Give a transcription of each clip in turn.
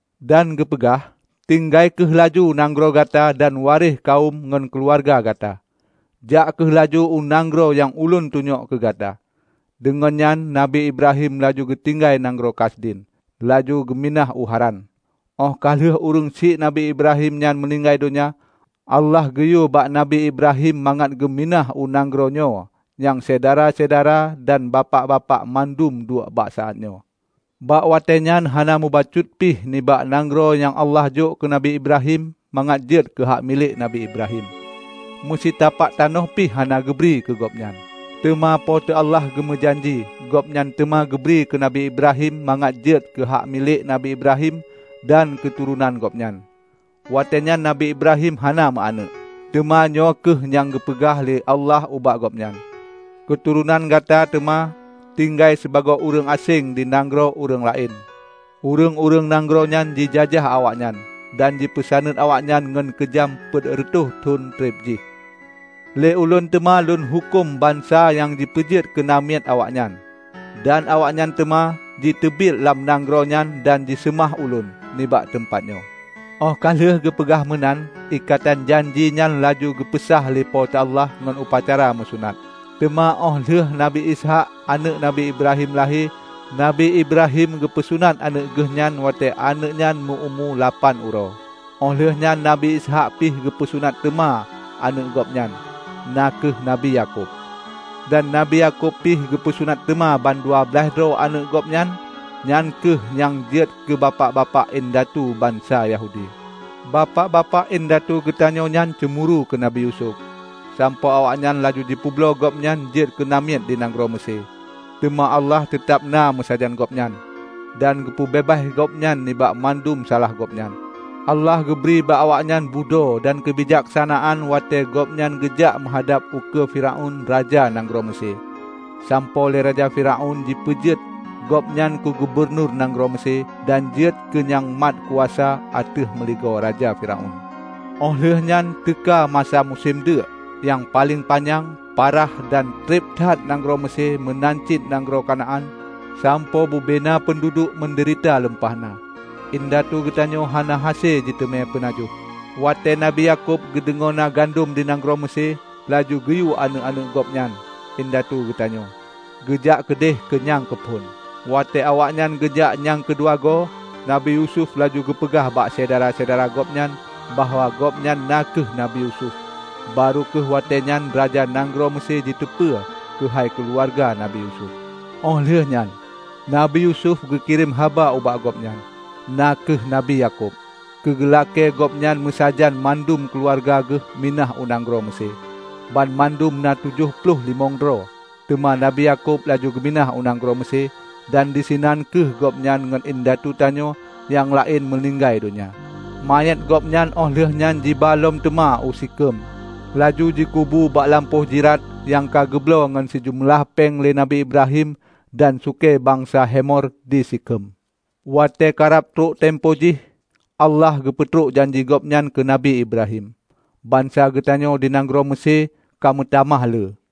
dan geupeugah, 'Tinggai kheueh laju nanggroe gata dan waréh kawöm ngon keuluwarga gata. Jak kheueh laju u nanggroe nyang ulôn tunyok keu gata.' Deungon nyan, Nabi Ibrahim laju geutinggai nanggroe Kasdim, laju geuminah u Haran. Óh ka lheueh ureuëng syiek Nabi Ibrahim nyan meuninggai donya, Allah geuyue bak Nabi Ibrahim mangat geuminah u nanggroe nyoe nyang syedara-syedara dan Bapak-bapak mandum duek bak saát nyoe. Bak watée nyan hana mubacut pih nibak nanggroe nyang Allah jok keu Nabi Ibrahim mangat jeuet keu hak milék Nabi Ibrahim; meusitapak tanoh pih hana geubri keu gobnyan. Teuma Po teu Allah geumeujanji Gobnyan teuma geubri keu Nabi Ibrahim mangat jeuet keu hak milék Nabi Ibrahim dan keuturonan gobnyan. Watée nyan Nabi Ibrahim hana meu aneuëk. Teuma nyoe kheueh nyang geupeugah lé Allah ubak gobnyan, 'Keuturonan gata teuma tinggai sibagoe ureuëng aséng di nanggroe ureuëng laén. Ureuëng-ureuëng nanggroe nyan jijajah awaknyan dan jipeusaneut awaknyan ngon keujam peuet reutôh thon treb jih. Lé Ulôn teuma Lôn huköm bansa nyang jipeujeuet keu namiet awaknyan, dan awaknyan teuma jiteubiet lam nanggroe nyan dan jiseumah Ulôn nibak teumpat nyoe.' Óh ka lheueh geupeugah meunan ikatan janji nyan laju geupeusah lé Po teu Allah ngon upacara meusunat. Teuma óh lheueh Nabi Ishaq, aneuëk Nabi Ibrahim lahé, Nabi Ibrahim geupeusunat aneuëk geuhnyan watée aneuëk nyan meu-umu lapan uroe. Óh lheueh nyan Nabi Ishaq pih geupeusunat teuma aneuëk gobnyan, na kheueh Nabi Yakub. Dan Nabi Yakub pih geupeusunat teuma ban dua blaih droe aneuëk gobnyan, nyan kheueh nyang jeuet keu bapak-bapak indatu bansa Yahudi. Bapak-bapak indatu geutanyoe nyan ceumuru keu Nabi Yusuf, sampoe awaknyan laju jipeubloe gobnyan jeuet keu namiet di nanggroe Meusé. Teuma Allah teutab na meusajan gobnyan, dan geupeubeubaih gobnyan nibak mandum salah gobnyan. Allah geubri bak awaknyan budho dan keubijaksanaan watée gobnyan geujak meuhadab ukeue Firaun raja nanggroe Meusé, sampoe lé raja Firaun jipeujeuet gobnyan keu gubunur nanggroe Meusé dan jeuet keu nyang mat kuasa ateueh meuligoe raja Firaun. Óh lheuehnyan teuka masa musém deuk nyang paleng panyang parah dan treb that di nanggroe Meusé meunan cit nanggroe Kanaan sampoe bubena peunduduek meudeurita lumpah na. Indatu geutanyoe hana hase jiteumé peunajoh. Watée Nabi Yakub geudeungoe na gandom di nanggroe Meusé laju geuyue aneuëk-aneuëk gobnyan, indatu geutanyoe, geujak keudeh keu nyang keu phon. Watée awaknyan geujak nyang keudua goe, Nabi Yusuf laju geupeugah bak syedara-syedara gobnyan, bahwa gobnyan na kheueh Nabi Yusuf. Barô kheueh watée nyan raja nanggroe Meusé jiteupeue keuhai keuluwarga Nabi Yusuf. Óh lheueh nyan Nabi Yusuf geukirém haba ubak ayah gobnyan, na kheueh Nabi Yakub, keu geulakée gobnyan meusajan mandum keuluwarga geuh minah u nanggroe Meusé -- banmandum na tujoh ploh limong droe. Teuma Nabi Yakub laju geuminah u nanggroe Meusé dan disinan kheueh gobnyan ngon indatu tanyoe nyang laén meuninggai donya. Manyét gobnyan óh lheueh nyan jiba lom teuma u Sikhem laju jikubu bak lampôh jrat nyang geubloe ngon sijeumeulah péng lé Nabi Ibrahim dan sukée bansa Hemor di Sikhem. Watée karab trok tempo jih Allah geupeutrok janji Gobnyan keu Nabi Ibrahim, bansa geutanyoe di nanggroe Meusé ka meutamah le.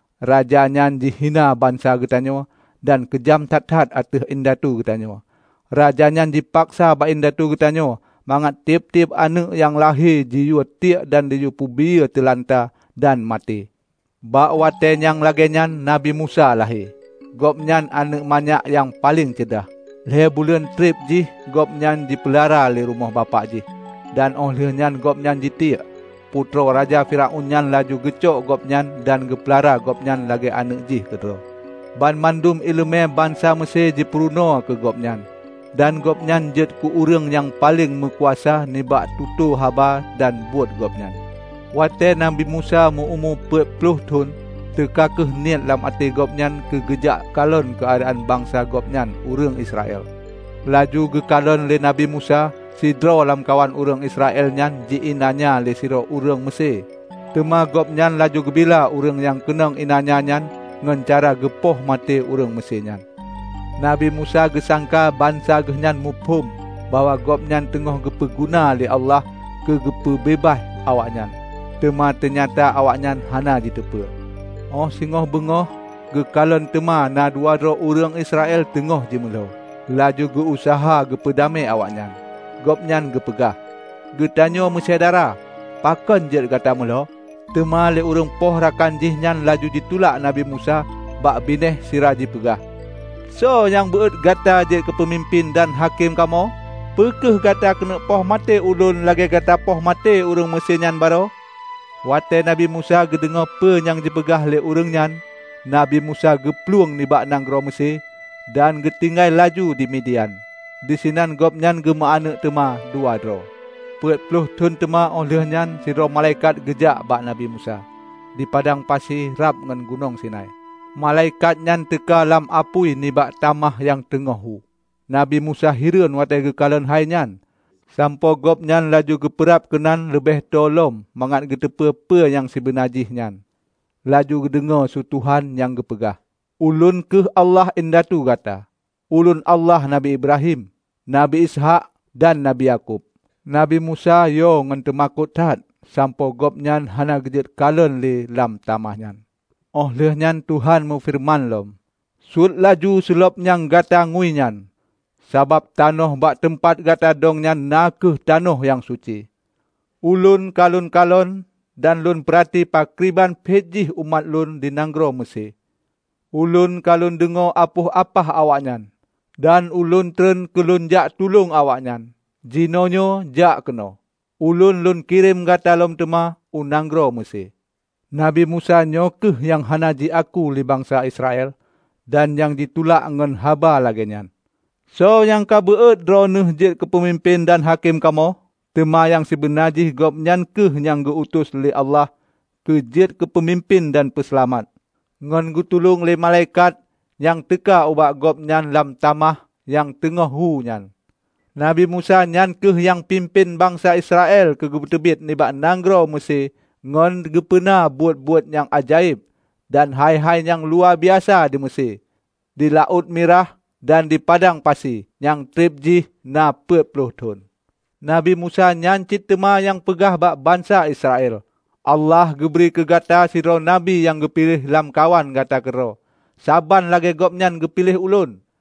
Raja nyan jihina bansa geutanyoe dan keujam that-that ateueh indatu geutanyoe. Raja nyan jipaksa bak indatu geutanyoe mangat tieb-tieb aneuëk nyang lahé jiyue tiek dan jipeubiyeu teulanta dan maté. Bak watée nyang lagée nyan nabi Musa lahé; gobnyan aneuëk manyak nyang paleng ceudah. Lhée buleuen treb jih gobnyan jipeulara di rumoh bapak jih, dan óh ka lheueh gobnyan jitiek, putroe raja Firaun nyan laju jicok gobnyan dan jipeulara gobnyan lagée aneuëk jih keudroe. Banmandum iéleumé bansa Meusé jipeurunoe keu gobnyan dan gobnyan jeuet keu ureuëng nyang paleng meukuasa nibak tutoe haba dan buet gobnyan. Watée Nabi Musa meu-umu peuet ploh thon, teuka kheueh niet lam até gobnyan keu geujak kalon keuadaan bansa gobnyan ureuëng Israel. Laju geukalon lé Nabi Musa sidroe lamkawan ureuëng Israel nyan ji iénanya lé sidroe ureuëng Meusé; teuma gobnyan laju geubila ureuëng nyang keunong iénanya nyan ngon cara geupoh maté ureuëng Meusé nyan. Nabi Musa geusangka bansa geuhnyan muphom bahwa gobnyan teungoh geupeu guna lé Allah keu geupeu beubaih awaknyan. Teuma teunyata awaknyan hana jiteupeue. Óh singoh beungoh geukalon teuma na dua droe ureuëng Israel teungoh jimeulo, laju geu-useuha geupeu damé awaknyan. Gobnyan geupeugah, 'Gatanyoe meusyedara, pakon jeuet gata meulo?' Teuma lé ureuëng poh rakan jih nyan laju jitulak Nabi Musa bak binéh sira jipeugah, 'Soe nyang beuot gata jeuet keupeumimpén dan hakém kamoe? Peu kheueh gata keuneuk poh maté ulôn lagée gata poh maté ureuëng Meusé nyan baroe?' Watée Nabi Musa geudeungoe peue nyang jipeugah lé ureuëng nyan, Nabi Musa geuplueng nibak nanggroe Meusé dan geutinggai laju di Midian. Disinan gobnyan geumeu aneuëk teuma dua droe. Peuet ploh thon teuma óh lheueh nyan sidroe malaikat geujak bak Nabi Musa di padang pasi rab ngon Gunong Sinai. Malaikat nyan teuka lam apui nibak tamah nyang teungoh hu. Nabi Musa hireuen watée geukalon hai nyan, sampoe gobnyan laju geupeurab keunan leubeh tô lom mangat geuteupeue peue nyang sibeuna jih nyan. Laju geudeungoe su Tuhan nyang geupeugah, 'Ulôn kheueh Allah indatu gata; Ulôn Allah Nabi Ibrahim, Nabi Ishaq dan Nabi Yakub.' Nabi Musa yo ngon teumakot that sampoe gobnyan hana geujeuet kalon le lam tamah nyan. Óh lheueh nyan Tuhan meufeureuman lom, 'Suet laju seulob nyang gata ngui nyan, sabab tanoh bak teumpat gata dong nyan na kheueh tanoh nyang suci. Ulôn ka Ulôn kalon dan Lôn peurati pakriban phet jih umat Ulôn di nanggroe Meusé. Ulôn ka Lôn deungoe apoh apah awaknyan dan Ulôn treun keu Lôn jak tulông awaknyan. Jinoenyoe, jak keunoe! Ulôn Lôn kirém gata lom teuma u nanggroe Meusé.' Nabi Musa nyoe kheueh nyang hana jiaku lé bansa Israel dan nyang jitulak ngon haba lagée nyan, 'Soe nyang ka beuot droeneueh jeuet keu peumimpén dan hakém kamoe?' Teuma nyang sibeuna jih gobnyan kheueh nyang geu-utus lé Allah keu jeuet keu peumimpén dan peuseulamat, ngon geutulông lé malaikat nyang teuka ubak gobnyan lam tamah nyang teungoh hu nyan. Nabi Musa nyan kheueh nyang pimpén bansa Israel geupeuteubiet nibak nanggroe Meusé ngon geupeuna buet-buet nyang ajaéb dan hai-hai nyang luwabiasa di Meusé, di Laôt Mirah dan di padang pasi nyang treb jih na peuet ploh thon. Nabi Musa nyan cit teuma nyang peugah bak bansa Israel, 'Allah geubri keu gata sidroe Nabi nyang geupiléh lamkawan gata keudroe, saban lagée Gobnyan geupiléh ulôn.'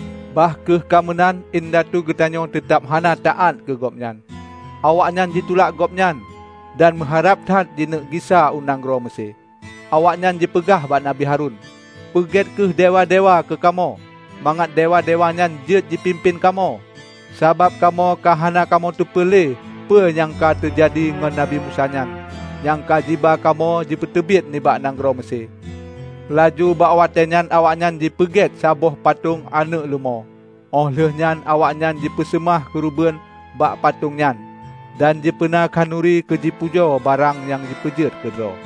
Bah kheueh ka meunan indatu geutanyoe teutab hana taát keu gobnyan. Awaknyan jitulak gobnyan dan meuharab that jikeuneuk gisa u nanggroe Meusé. Awaknyan jipeugah bak Nabi Harun, 'Peugét kheueh dewa-dewa keu kamoe, mangat dewa-dewa nyan jeuet jipimpén kamoe. Sabab kamoe ka hana kamoe teupeue le peue nyang teujadi ngon Nabi Musa nyan nyang ka jiba kamoe jipeuteubiet nibak nanggroe Meusé!' Laju bak watée nyan awaknyan jipeuget saboh patong aneuëk leumô, óh lheueh nyan awaknyan jipeuseumah keureubeuen bak patong nyan dan jipeuna khanuri keu jipujoe barang nyang jipeuget keudroe.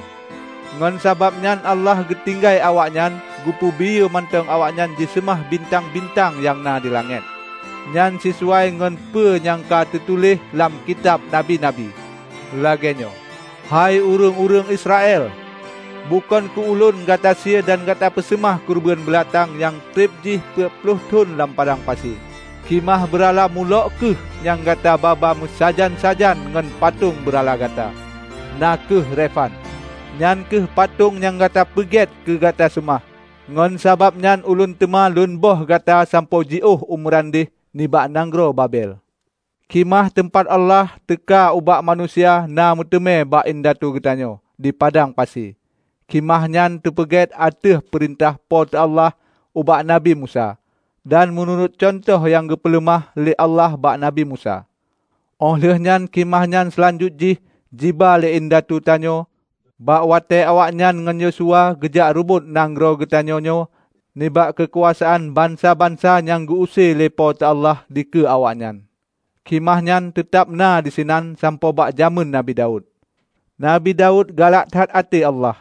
Ngon sabab nyan Allah geutinggai awaknyan geupeubiyeu mantong awaknyan jiseumah bintang-bintang nyang na di langét. Nyan sisuai ngon peue nyang ka teutuléh lam kitab Nabi-nabi. Legée nyoe, 'Hai ureuëng-ureuëng Israel! Bukon keu Ulôn gata sie dan gata peuseumah keureubeuen beulatang nyang treb jih peuet ploh thon lam padang pasi. Khimah beurala Molokh kheueh nyang gata ba-ba meusajan-sajan ngon patong beurala gata, na kheueh Refan; nyan kheueh patong nyang gata peuget keu gata seumah. Ngon sabab nyan ulôn teuma lôn böih gata sampoe jiôh u meurandeh nibak nanggroe Babel.' Khimah teumpat Allah teuka ubak manusia na meuteumé bak indatu geutanyoe di padang pasi. Khimah nyan teupeuget ateueh peurintah Po teu Allah ubak Nabi Musa dan meunurot cuntoh nyang geupeuleumah lé Allah bak Nabi Musa. Óh lheuehnyan khimah nyan seulanjut jih jiba lé indatu tanyoe bak watée awaknyan ngon Yosua geujak reubot nanggroe geutanyoe nyoe nibak keukuasaan bansa-bansa nyang geu-use lé Po teu Allah dikeue awaknyan. Khimah nyan teutab na disinan sampoe bak jamén Nabi Daud. Nabi Daud galak that até Allah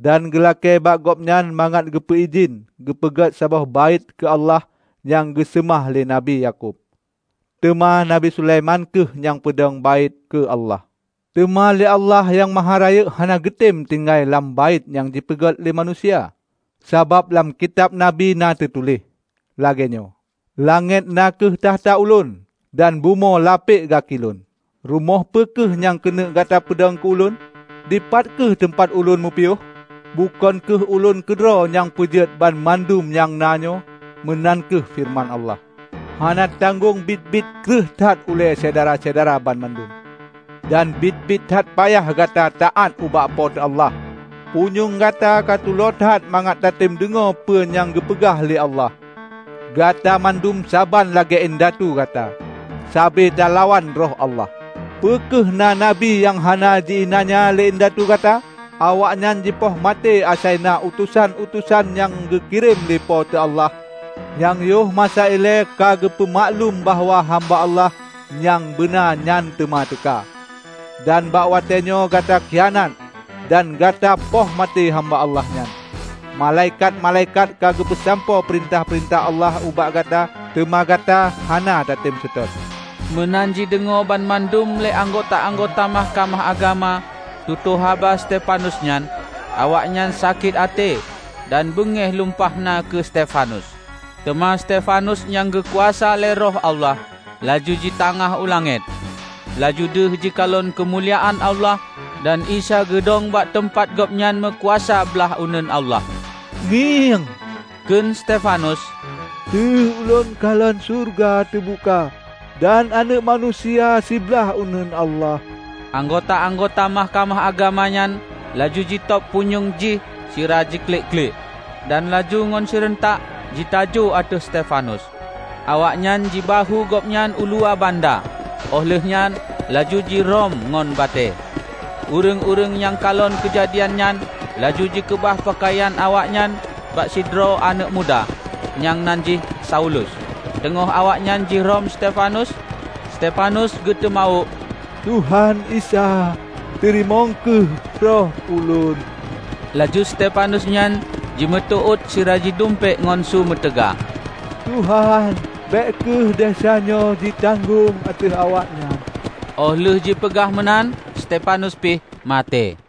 dan geulakée bak Gobnyan mangat geupeu idhin geupeuget saboh Baét keu Allah nyang geuseumah lé Nabi Yakub. Teuma Nabi Sulaiman kheueh nyang peudong Baét keu Allah. Teuma lé Allah Nyang Maharayeuk hana geutem tinggai lam Baét nyang dipeuget lé manusia; sabab lam kitab Nabi na teutuléh lagée nyoe, 'Langét na kheueh takhta Ulôn, dan bumoe lapek gaki Lôn. Rumoh peu kheueh nyang keuneuk gata peudong keu Ulôn? Dipat kheueh teumpat Ulôn meupiôh? Bukon kheueh Ulôn keudroe nyang peujeuet banmandum nyang na nyoe?' meunan kheueh feureuman Allah. Hana tanggong biet-biet kreueh that ulée syedara-syedara banmandum dan biet-biet that payah gata taát ubak Po teu Allah! Punyueng gata ka tulo that mangat tatem deungoe peue nyang geupeugah lé Allah! Gata mandum saban lagée indatu gata; sabe talawan Roh Allah! Peu kheueh na nabi nyang hana ji iénanya lé indatu gata? Awaknyan jipoh maté asai na utosan-utosan nyang geukirém lé Po teu Allah nyang yoh masa ilée ka geupeu maklum bahwa hamba Allah nyang beuna nyang teuma teuka. Dan bak watée nyoe gata khianat dan gata poh maté Hamba Allah nyan. Malaikat-malaikat ka geupeusampoe peurintah-peurintah Allah ubak gata teuma gata hana tatem seutôt!" Meunan jideungoe banmandum lé anggota-anggota Mahkamah Agama tutoe haba Stefanus nyan, awaknyan sakét até dan beungéh lumpah na keu Stefanus. Teuma Stefanus nyang geukuasa lé Roh Allah, laju jitangah u langét. Laju deuh jikalon keumuliaan Allah dan Isa geudong bak teumpat Gobnyan meukuasa blaih uneuen Allah. "Ngieng," kheun Stefanus, "Deuh ulôn kalon syeuruga teubuka dan Aneuëk Manusia siblaih uneuen Allah!" Anggota-anggota Mahkamah Agama nyan laju jitôb punyueng jih sira jiklik-klik, dan laju ngon sireuntak jitajoe ateueh Stefanus. Awaknyan jibahue gobnyan uluwa banda óh lheueh nyan laju jirhom ngon batée. Ureuëng-ureuëng nyang kalon keujadian nyan laju jikeubah peukayan awaknyan bak sidroe aneuëk muda nyang nan jih Saulus. Teungoh awaknyan jirhom Stefanus, Stefanus geuteumawök, "Tuhan Isa, teurimong kheueh roh ulôn!" Laju Stefanus nyan jimeuteuôt sira jidumpék ngon su meutaga, "Tuhan, bék kheueh desya nyoe jitanggong ateueh awaknyan!" Óh lheueh jipeugah meunan Stefanus pih maté.